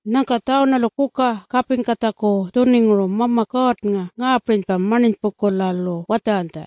Nyangka Tjawunalu kuka kapingkatjaku tjuninguru Mama Kuurrnga ngaapirinypa marninypungkula-lu watjaranytja,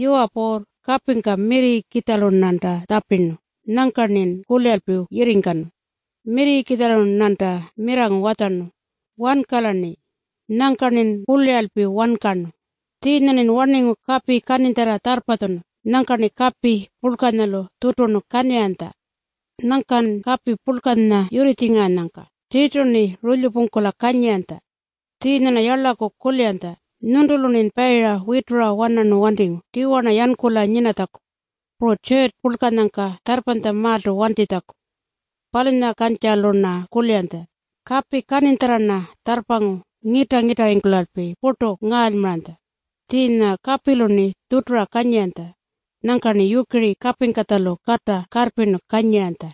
“Yuwa Puurr, kapingka mirrirrikitjalu-rnanta tjapirnu, nyangka-rnin kuliralpi yirringkanu. Mirrirrikitjalu-rnanta mirrangu watjarnu, ‘Wankala-rni!’ Nyangka-rnin kuliralpi wankarnu. Tjiinya-rnin warningu kapi kaninytjarra tjarrpatjunu, nyangka-rni kapi purlkanyalu tjuturnu kanyiranytja. Nyangkan kapi purlkanya yurritjingaranyangka tirtu-rni rulyupungkula kanyiranytja. Tjiinya-rna yarlaku kuliranytja nyuntulu-rnin payira witura-wanarnu wantingu tiwa-rna yankula nyinatjaku, puru tjurrtju purlkanyangka tjarrpanytjamaaltu wantitjaku. Palunyakukantjalu-rna kuliranytja. Kapi kaninytjarra-rna tjarrpangu ngita-ngitarringkulalpi purtu ngaalymaranytja. Tjiinya kapilu-rni tjutura kanyiranytja. Nyangka-rni yukiri kapingkatjalu kata karrpirnu kanyiranytja.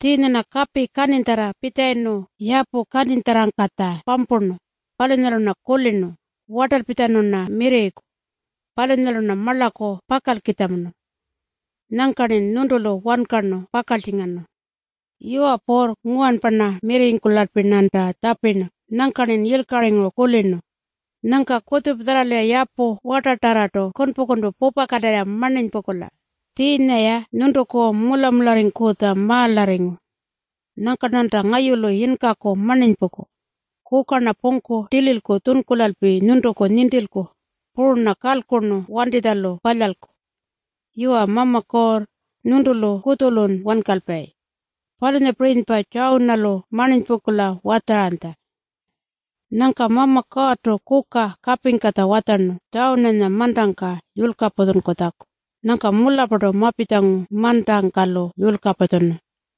Tjiinya-rna kapi kaninytjarra pitjalayirnu yapu kaninytjarrangkatja pampurnu. Palunyalu-rna kulirnu, ‘Wartalpitjanu-rna mirrirriku. Palunyalu-rna marlaku pakalkitjamunu.’ Nyangka-rnin nyuntulu wankarnu pakaltjingarnu. Yuwa Puurr, nguwanpa mirrirringkulalpi-rnanta tjapirnu nyangka-rnin yilkaringuru kulirnu. Nyangka kutjupatjarralu-ya yapu wartatarrartu kunpu-kunpu pupakatirra marninypungkula. Tjiinya-ya nyuntuku mula-mularringkutjamaalarringu. Nyangka-rnanta ngayulu yinkaku marninypungku. Kuka-rna pungku tililku tjunkulalpi nyuntuku nintilku. Puru-rna kalkurnu wantitjalu palyalku. Yuwa Mama Kuurr, nyuntulu kutjulun wankalpayi.” Palunyapirinypa Tjawunalu marninypungkula watjaranytja. Nyangka Mama Kuurrtu kuka kapingkatja watjarnu Tjawunanya mantangka yulkapatjunkutjaku. Nyangka mularrpartu mapitjangu mantangka-lu yulkapatjunu.